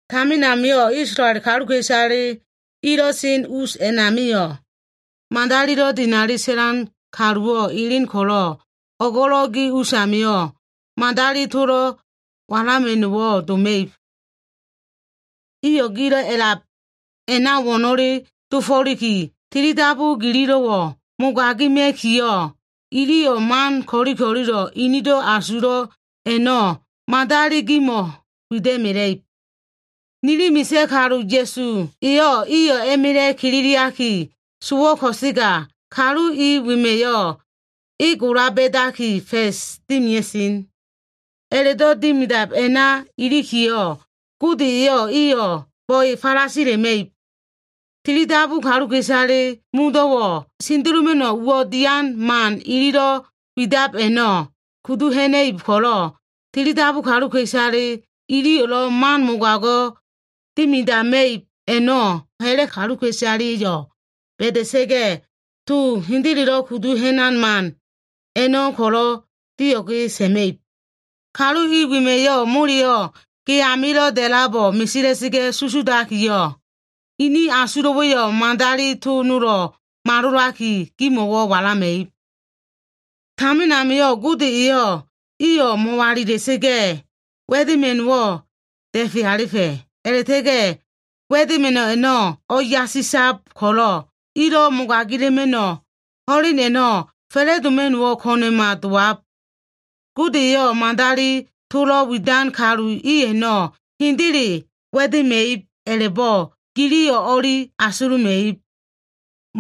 Tamin amio꞉ Isolael kaluka꞉isale ilo꞉ sen us a꞉namio꞉, madalilo꞉ dinali sa꞉lan kaluwo꞉ elen ko꞉lo꞉, o꞉go꞉lo꞉ gi usamio꞉ madali tolo꞉ walama꞉no꞉wo꞉ doma꞉ib. Iyo꞉ gilo꞉ a꞉lab a꞉na wo꞉no꞉le dofo꞉liki, tilidabu gililo꞉wo꞉ mogagima꞉kiyo꞉, iliyo꞉ man ko꞉li ko꞉lilo꞉ inido꞉ asulo꞉ a꞉no꞉ madali gimo꞉ walama꞉ib. Nili misa꞉ kalu Ya꞉su eyo꞉, iyo꞉ a꞉ma꞉la꞉ kililiaki sowo꞉ ko꞉sega, kalu i wema꞉yo꞉ e gola ba꞉daki, fa꞉s dimia꞉sen. A꞉la꞉do꞉ dimidab a꞉na ilikiyo꞉, Gode eyo꞉ iyo꞉ bo꞉e falasila꞉ma꞉ib. Tilidabu kaluka꞉isale modo꞉wo꞉ sendeloma꞉no꞉ uwo꞉ dian man ililo꞉ widab a꞉no꞉ kudu ha꞉na꞉ib ko꞉lo꞉, tilidabu kaluka꞉isale ililo꞉ man mogago꞉ dimidama꞉ib a꞉no꞉ ha꞉la꞉ kaluka꞉isaleyo꞉ ba꞉da꞉sa꞉ga꞉, to hendelelo꞉ kudu ha꞉nan man a꞉no꞉ ko꞉lo꞉ dio꞉ge sa꞉ma꞉ib. Kalu i wema꞉yo꞉ moleyo꞉ ge amilo꞉ da꞉labo꞉ mesela꞉sa꞉ga꞉ susudakiyo꞉, inin asulo꞉wa꞉yo꞉ madali to nolo꞉ malolaki gimo꞉ walama꞉ib. Tamin amio꞉ Gode eyo꞉ iyo꞉ mo꞉walila꞉sa꞉ga꞉, wa꞉dema꞉no꞉wo꞉ da꞉fe alifa꞉. A꞉la꞉ta꞉ga꞉ wa꞉dema꞉no꞉ a꞉no꞉ o꞉yasisab ko꞉lo꞉, ilo꞉ mogagila꞉ma꞉no꞉ ho꞉len a꞉no꞉ fa꞉la꞉doma꞉no꞉wo꞉ ko꞉na꞉ma dowab. Gode eyo꞉ madali tolo꞉ widan kalu i a꞉no꞉ hendele wa꞉dema꞉ib a꞉la꞉bo꞉ giliyo꞉ o꞉li asuluma꞉ib.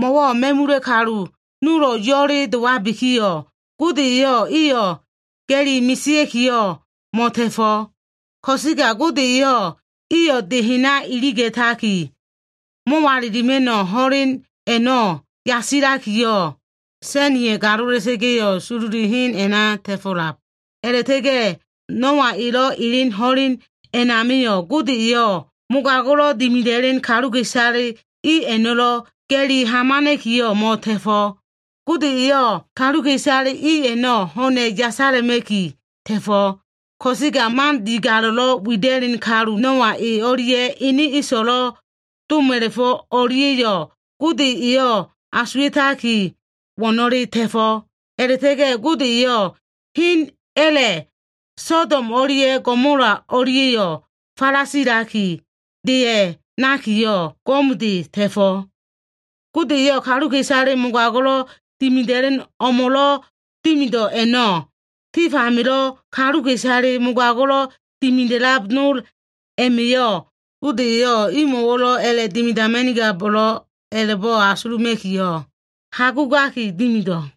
Mo꞉wo꞉ ma꞉mula꞉ kalu nolo꞉ yo꞉le dowabikiyo꞉, Gode eyo꞉ iyo꞉ ga꞉li mesea꞉kiyo꞉ mo꞉ta꞉fo꞉. Ko꞉sega Gode eyo꞉ iyo꞉ de hena iliga꞉taki, mo꞉walilima꞉no꞉ ho꞉len a꞉no꞉ yasilakiyo꞉, sa꞉niya꞉ galola꞉sa꞉ga꞉yo꞉ sololi hen a꞉na ta꞉fo꞉lab. A꞉la꞉ta꞉ga꞉ Noa elo꞉ elen ho꞉len a꞉namio꞉, Gode eyo꞉ mogago꞉lo꞉ dimida꞉len kaluka꞉isale i a꞉no꞉lo꞉ ga꞉li hamana꞉kiyo꞉ mo꞉ta꞉fo꞉. Gode eyo꞉ kaluka꞉isale i a꞉no꞉ ho꞉na꞉ yasala꞉ma꞉ki ta꞉fo꞉. Ko꞉sega man digalo꞉lo꞉ wida꞉len kalu Noa, e o꞉lia꞉ ene so꞉lo꞉ doma꞉la꞉fo꞉ o꞉lia꞉yo꞉, Gode eyo꞉ asuwa꞉taki wo꞉no꞉le ta꞉fo꞉. A꞉la꞉ta꞉ga꞉ Gode eyo꞉ hen a꞉la꞉ Sodom o꞉lia꞉ Gomola o꞉lia꞉yo꞉ falasilaki, deya꞉ nakiyo꞉ go꞉mde ta꞉fo꞉. Gode eyo꞉ kaluka꞉isale mogago꞉lo꞉ dimida꞉len o꞉mo꞉lo꞉ dimido꞉ a꞉no꞉, tif amilo꞉ kaluka꞉isale mogago꞉lo꞉ dimida꞉lab nol a꞉ma꞉yo꞉ Gode eyo꞉ imo꞉wo꞉lo꞉ a꞉la꞉dimidama꞉nigabo꞉lo꞉b a꞉la꞉bo꞉ asuluma꞉kiyo꞉ hagugaki dimido꞉.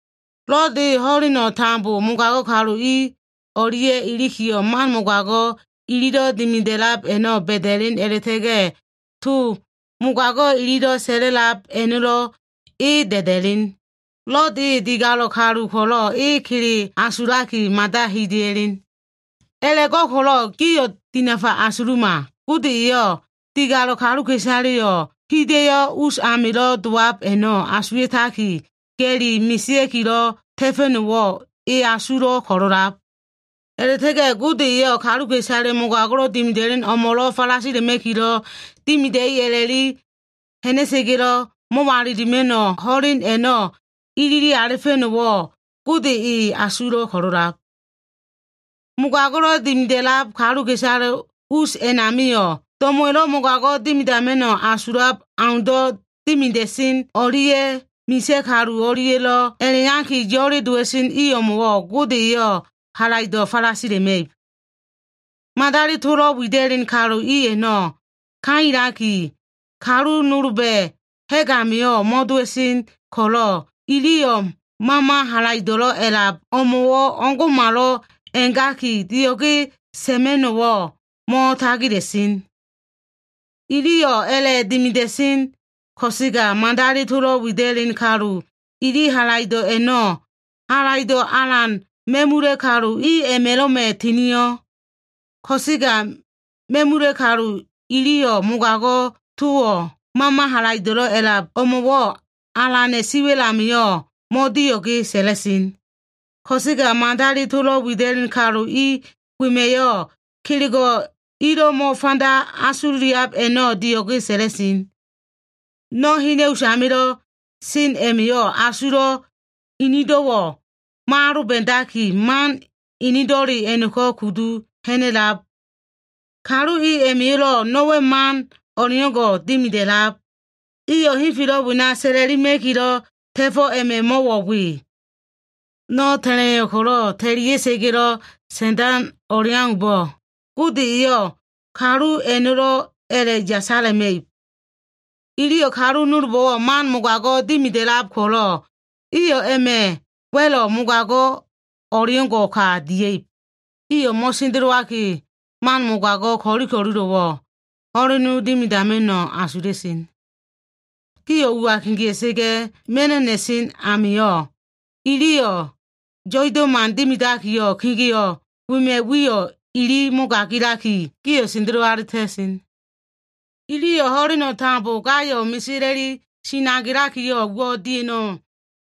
Lod e ho꞉leno꞉ tambo mogago꞉ kalu i o꞉lia꞉ ilikiyo꞉, man mogago꞉ ililo꞉ dimida꞉lab a꞉no꞉ ba꞉da꞉len a꞉la꞉ta꞉ga꞉, to mogago꞉ ililo꞉ sa꞉la꞉lab a꞉no꞉lo꞉ e da꞉da꞉len. Lod e digalo꞉ kalu ko꞉lo꞉ e kele asulaki mada hida꞉ya꞉len. A꞉la꞉go꞉ko꞉lo꞉ gio꞉ dinafa asuluma. Gode eyo꞉ digalo꞉ kaluka꞉isaleyo꞉ hida꞉yo꞉ us amilo꞉ dowab a꞉no꞉ asuwa꞉taki, ga꞉li mesea꞉kilo꞉ ta꞉fa꞉no꞉wo꞉ e asulo꞉ ko꞉lo꞉lab. A꞉la꞉ta꞉ga꞉ Gode eyo꞉ kaluka꞉isale mogago꞉lo꞉ dimida꞉len o꞉mo꞉lo꞉ falasilakilo꞉ dimia꞉i a꞉la꞉li ha꞉na꞉sa꞉ga꞉lo꞉, mo꞉walilima꞉no꞉ ho꞉len a꞉no꞉ ilili alifa꞉no꞉wo꞉, Gode e asulo꞉ ko꞉lo꞉lab. Mogago꞉lo꞉ dimida꞉lab kaluka꞉isale us a꞉namio꞉, do꞉mo꞉wa꞉lo꞉ mogago꞉ dimidama꞉no꞉ asulab aundo꞉ dimida꞉sen o꞉lia꞉ misa꞉ kalu o꞉lia꞉lo꞉ a꞉la꞉iyaki, yo꞉le dowa꞉sen i o꞉mo꞉wo꞉ Gode eyo꞉ halaido꞉ falasila꞉ma꞉ib. Madali tolo꞉ widan kalu i a꞉no꞉ kailaki, kalu nolba꞉ ha꞉g amio꞉ mo꞉dowa꞉sen ko꞉lo꞉, iliyo꞉ mama halaido꞉lo꞉ a꞉lab o꞉mo꞉wo꞉ o꞉ngo꞉malo꞉ a꞉gaki, dio꞉ge sa꞉ma꞉no꞉wo꞉ mo꞉tagila꞉sen. Iliyo꞉ a꞉la꞉dimida꞉sen ko꞉sega, madali tolo꞉ widan kalu ili halaido꞉ a꞉no꞉, halaido꞉ alan ma꞉mula꞉ kalu i a꞉ma꞉lo꞉ma꞉ tinio꞉. Ko꞉sega ma꞉mula꞉ kalu iliyo꞉ mogago꞉ towo꞉ mama halaido꞉lo꞉ a꞉lab o꞉mo꞉wo꞉ Alana꞉ siwa꞉l amio꞉ mo꞉dio꞉ge sa꞉la꞉sen. Ko꞉sega madali tolo꞉ widan kalu i wema꞉yo꞉ kelego꞉ ilo꞉ mo꞉fanda asululiab a꞉no꞉ dio꞉ge sa꞉la꞉sen. No꞉ hena꞉ usamilo꞉ san a꞉ma꞉yo꞉ asulo꞉ enedo꞉wo꞉ mo꞉aloba꞉daki, man enedo꞉le a꞉no꞉ko꞉ kudu ha꞉na꞉lab. Kalu i a꞉ma꞉yo꞉lo꞉ no꞉wa꞉ man o꞉leo꞉ngo꞉ dimida꞉lab. Iyo꞉ henfelo꞉ wena sa꞉la꞉lima꞉kilo꞉ ta꞉fo꞉ a꞉ma꞉ mo꞉wo꞉ we. No꞉ ta꞉la꞉iyo꞉ ko꞉lo꞉ ta꞉lia꞉sa꞉ga꞉lo꞉ sa꞉ndan o꞉leaumbo꞉, Gode eyo꞉ kalu i a꞉no꞉lo꞉ a꞉la꞉ yasala꞉ma꞉ib. Iliyo꞉ kalu nolbo꞉wo꞉ man mogago꞉ dimida꞉lab ko꞉lo꞉, iyo꞉ a꞉ma꞉ wa꞉lo꞉ mogago꞉ o꞉leo꞉ngo꞉ ka dia꞉ib. Iyo꞉ mo꞉sendelowaki, man mogago꞉ ko꞉li ko꞉lilo꞉wo꞉ ho꞉lena dimidama꞉no꞉ asula꞉sen. Gio꞉ ua kegea꞉sa꞉ga꞉ ma꞉no꞉ na꞉sen amio꞉, iliyo꞉ yo꞉ido꞉ man dimidakiyo꞉, kegeo꞉ wema꞉ wiyo꞉ ili mogagilaliki, gio꞉ sendelo alita꞉sen. Iliyo꞉ ho꞉leno꞉ tambo gayo꞉ mesela꞉li sinagea꞉likiyo꞉, uwo꞉ dia꞉no꞉wo꞉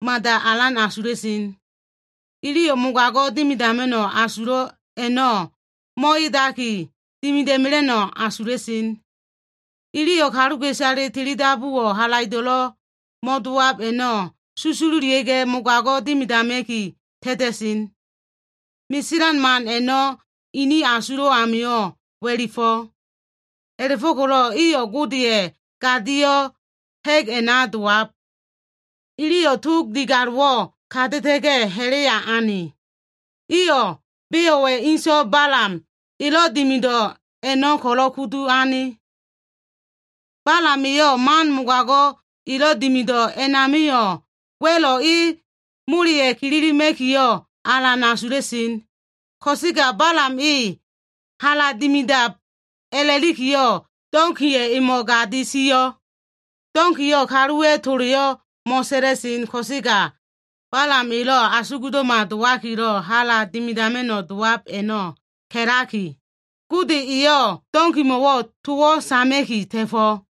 mada alan asula꞉sen. Iyo꞉ mogago꞉ dimidama꞉no꞉ asulo꞉ a꞉no꞉ mo꞉edaki, dimida꞉mela꞉no꞉ asula꞉sen. Iliyo꞉ kaluka꞉isale tilidabuwo꞉ halaido꞉lo꞉ mo꞉dowab a꞉no꞉ susululia꞉ga꞉, mogago꞉ dimidama꞉ki ta꞉ta꞉sen. Meselan man a꞉no꞉ inin asulo꞉ amio꞉ wa꞉lifo꞉. A꞉la꞉fo꞉ko꞉lo꞉ iyo꞉ Godeya꞉ gadio꞉ ha꞉g a꞉na dowab. Iliyo꞉ tog digalo꞉wo꞉ kata꞉ta꞉ga꞉, hala ane. Iyo꞉ Beowa꞉ inso꞉ Balam elo꞉ dimido꞉ a꞉no꞉ ko꞉lo꞉ kudu ane. Balam eyo꞉ man mogago꞉ elo꞉ dimido꞉ a꞉namio꞉ wa꞉lo꞉ e moleya꞉ kililima꞉kiyo꞉ alan asulo꞉. Ko꞉sega Balam e hala dimidab a꞉la꞉likiyo꞉, donkiya꞉ emo꞉ gadi sio꞉. Donkiyo꞉ kaluwa꞉ toleyo꞉ mo꞉sa꞉la꞉sen ko꞉sega, Balam elo꞉ asugdo꞉ma dowakilo꞉ hala dimidama꞉no꞉ dowab a꞉no꞉ ka꞉laki, Gode eyo꞉ donkimo꞉wo꞉ towo꞉ sama꞉ki ta꞉fo꞉.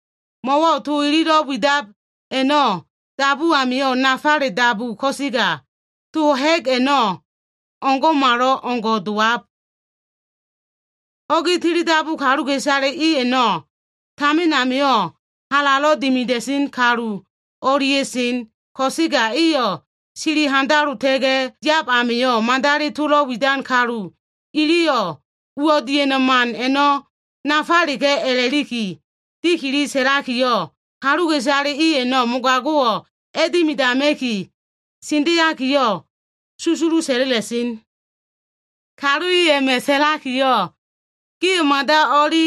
Mo꞉wo꞉ to ililo꞉ widab a꞉no꞉ dabu amio꞉ nafale dabu ko꞉sega, to ha꞉g a꞉no꞉ o꞉ngo꞉malo꞉ngo꞉ dowab. Ho꞉gi tilidabu kaluka꞉isale i a꞉no꞉, tamin amio꞉ halalo꞉ dimida꞉sen kalu o꞉lia꞉ sen, ko꞉sega iyo꞉ sili handalota꞉ga꞉ yab amio꞉, madali tolo꞉ widan kalu iliyo꞉ uwo꞉ dian man a꞉no꞉ nafaleka꞉ a꞉la꞉liki dikili sa꞉lakiyo꞉, kaluka꞉isale i a꞉no꞉ mogago꞉wo꞉ a꞉dimidama꞉ki sendeakiyo꞉, susulu sa꞉la꞉la꞉sen. Kalu i a꞉ma꞉ sa꞉lakiyo꞉, “Gio꞉ mada o꞉li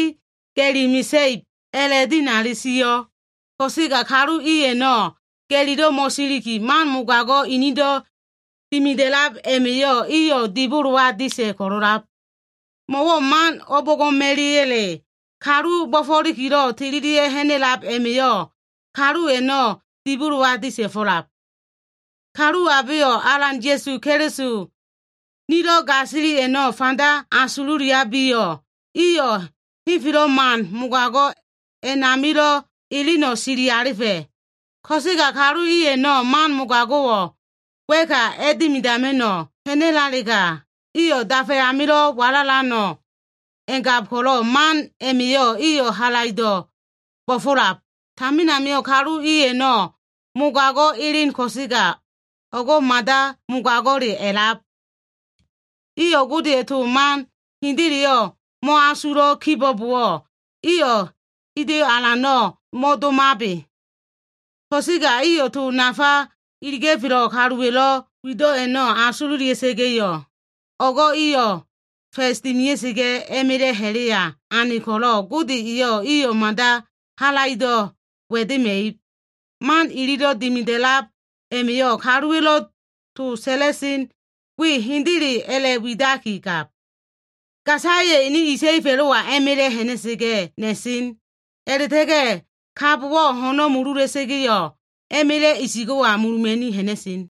ga꞉li mesa꞉ib” a꞉la꞉dinali sio꞉. Ko꞉sega kalu i a꞉no꞉ ga꞉lilo꞉ mo꞉siliki, man mogago꞉ inido꞉ dimida꞉lab a꞉ma꞉yo꞉ iyo꞉ dibolowa disa꞉ ko꞉lo꞉lab. Mo꞉wo꞉ man o꞉bo꞉ngo꞉ma꞉ya꞉le kalu bo꞉fo꞉likilo꞉ tililia꞉ ha꞉na꞉lab a꞉ma꞉yo꞉, kalu a꞉no꞉ dibolowa disa꞉fo꞉lab. Kalu abeyo꞉ Alan Ya꞉su Keliso, nilo꞉ gasili a꞉no꞉ fanda asululiabiyo꞉, iyo꞉ henfelo꞉ man mogago꞉ a꞉namilo꞉ eleno꞉ sili alifa꞉. Ko꞉sega kalu i a꞉no꞉ man mogago꞉wo꞉ wa꞉ka a꞉dimidama꞉no꞉ ha꞉nalega, iyo꞉ dafa amilo꞉ walalano꞉ a꞉ngab ko꞉lo꞉, man a꞉ma꞉yo꞉ iyo꞉ halaido꞉ bo꞉fo꞉lab. Tamin amio꞉ kalu i a꞉no꞉ mogago꞉ elen ko꞉sega, o꞉go꞉ mada mogago꞉le a꞉lab. Iyo꞉ Godeya꞉ to man hendeleyo꞉ mo꞉asulo꞉ kibo꞉bowo꞉, iyo꞉ hida꞉yo꞉ alano꞉ mo꞉domabe. Ko꞉sega iyo꞉ to nafa iliga꞉felo꞉ kaluwa꞉lo꞉ wido꞉ a꞉no꞉ asululia꞉sa꞉ga꞉yo꞉, o꞉go꞉ iyo꞉ fa꞉s dimia꞉sa꞉ga꞉, a꞉ma꞉la꞉ ha꞉la꞉ya ane ko꞉lo꞉, Gode eyo꞉ iyo꞉ mada halaido꞉ wa꞉dema꞉ib. Man ililo꞉ dimidab a꞉ma꞉yo꞉ kaluwa꞉lo꞉ to sa꞉la꞉sen we hendele a꞉la꞉widakigab. Gasaya꞉ ene isa꞉i fa꞉lo꞉wa a꞉ma꞉la꞉ ha꞉na꞉sa꞉ga꞉ na꞉sen. A꞉la꞉ta꞉ga꞉ kabowo꞉ ho꞉no꞉ mulula꞉sa꞉ga꞉yo꞉, a꞉ma꞉la꞉ isigo꞉wa muluma꞉ni ha꞉na꞉sen.